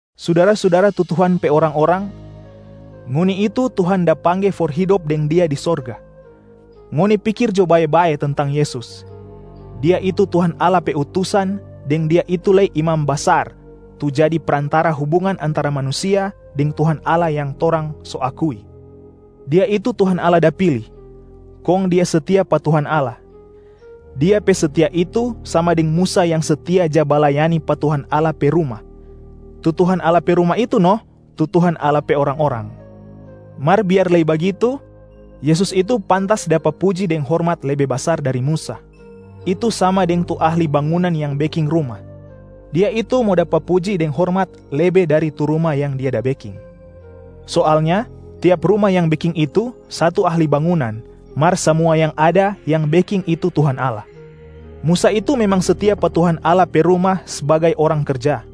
Sudara-sudara tu Tuhan pe orang-orang, ngoni itu Tuhan da pangge for hidop deng Dia di sorga. Ngoni pikir jo bae-bae tentang Yesus, Dia itu Tuhan Allah pe Utusan deng Dia itu lei Imam Basar tu jadi prantara hubungan antara manusia deng Tuhan Allah yang torang so akui. Dia itu Tuhan Allah da pili, kong Dia setia pa Tuhan Allah. Dia pe setia itu sama deng Musa yang setia ja balayani pa Tuhan Allah pe ruma, tu Tuhan Allah pe ruma itu no tu Tuhan Allah pe orang-orang. Mar biar lei bagitu, Yesus itu pantas dapa puji deng hormat lebe basar dari Musa. Itu sama deng tu ahli bangunan yang beking ruma, dia itu mo dapa puji deng hormat lebe dari tu ruma yang dia da beking. Soalnya tiap ruma yang beking itu satu ahli bangunan, mar samua yang ada, yang beking itu Tuhan Allah. Musa itu memang setia pa Tuhan Allah pe ruma sbagai orang karja.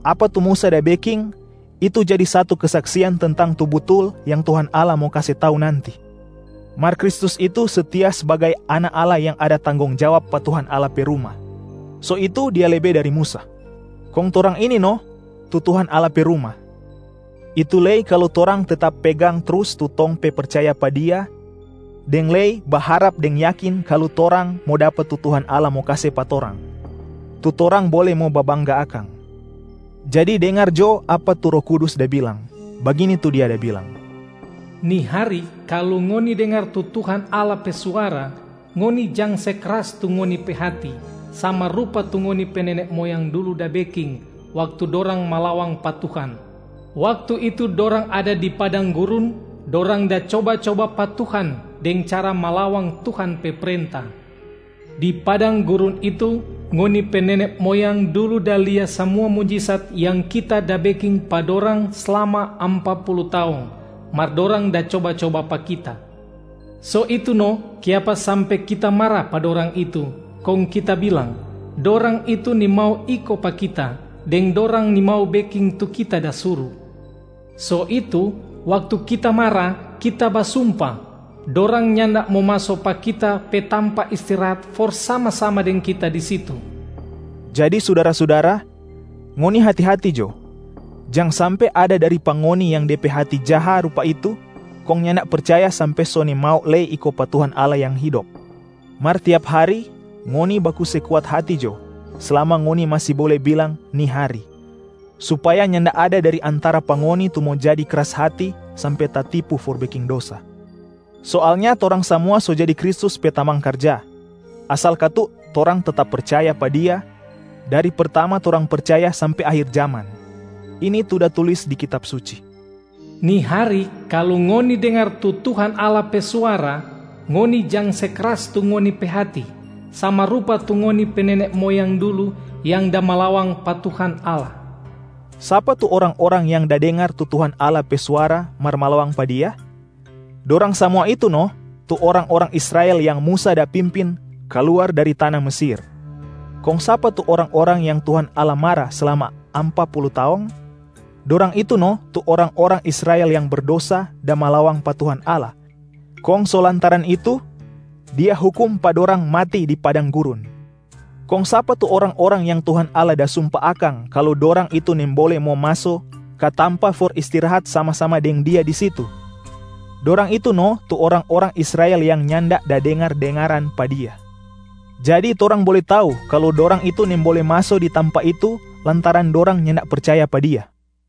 Apa tu Musa da beking, itu jadi satu kesaksian tentang tu butul yang Tuhan Allah mo kase tau nanti. Mar Kristus itu setia sbagai Anak Allah yang ada tanggong jawab pa Tuhan Allah pe ruma, so itu Dia lebe dari Musa. Kong torang ini no tu Tuhan Allah pe ruma, itu lei kalu torang tetap pegang trus tu tong pe percaya pa Dia deng lei baharap deng yakin kalu torang mo dapa tu Tuhan Allah mo kase pa torang, tu torang bole mo babangga akang.Jang se kras tu hati, iko jo pa Tuhan Jadi dengar jo apa tu Roh Kudus da bilang, bagini tu Dia da bilang, “Ni hari, kalu ngoni dengar tu Tuhan Allah pe suara, ngoni jang se kras tu ngoni pe hati, sama rupa tu ngoni pe nene moyang dulu da beking, waktu dorang malawang pa Tuhan. Waktu itu dorang ada di padang gurun, dorang da coba-coba pa Tuhan deng cara malawang Tuhan pe prenta. Di padang gurun itu, ngoni pe nene moyang dulu da lia samua mujisat yang Kita da beking pa dorang slama ampa pulu taong, mar dorang da coba-coba pa Kita. So itu no kiapa sampe Kita mara pa dorang itu, kong Kita bilang, ‘Dorang itu nimau iko pa Kita, deng dorang nimau beking tu Kita da suru.’ So itu, waktu Kita mara, Kita basumpa, ‘Dorang nyanda mo maso pa Kita pe tampa istirahat for sama-sama deng Kita di situ.’” Jadi sudara-sudara, ngoni hati-hati jo, jang sampe ada dari pa ngoni yang de pe hati jaha rupa itu kong nyanda percaya sampe so nimau lei iko pa Tuhan Allah yang Hidop. Mar tiap hari ngoni baku se kuat hati jo slama ngoni masi bole bilang “ni hari”, supaya nyanda ada dari antara pa ngoni tu mo jadi kras hati sampe tatipu for beking dosa. Soalnya torang samua so jadi Kristus pe tamang karja, asal katu torang tetap percaya pa Dia dari pertama torang percaya sampe akhir jaman. Ini tu da tulis di Kitab Suci, “Ni hari, kalu ngoni dengar tu Tuhan Allah pe suara, ngoni jang se kras tu ngoni pe hati, sama rupa tu ngoni pe nene moyang dulu yang da malawang pa Tuhan Allah.” Sapa tu orang-orang yang da dengar tu Tuhan Allah pe suara mar malawang pa Dia? Dorang samua itu no tu orang-orang Israel yang Musa da pimpin kaluar dari tana Mesir. Kong sapa tu orang-orang yang Tuhan Allah mara slama ampa pulu taong? Dorang itu no tu orang-orang Israel yang berdosa da malawang pa Tuhan Allah kong so lantaran itu Dia hukum pa dorang mati di padang gurun. Kong sapa tu orang-orang yang Tuhan Allah da sumpa akang kalu dorang itu nimbole mo maso ka tampa for istirahat sama-sama deng Dia di situ? Dorang itu no tu orang-orang Israel yang nyanda da dengar-dengaran pa Dia. Jadi torang bole tau kalu dorang itu nimbole maso di tampa itu lantaran dorang nyanda percaya pa Dia.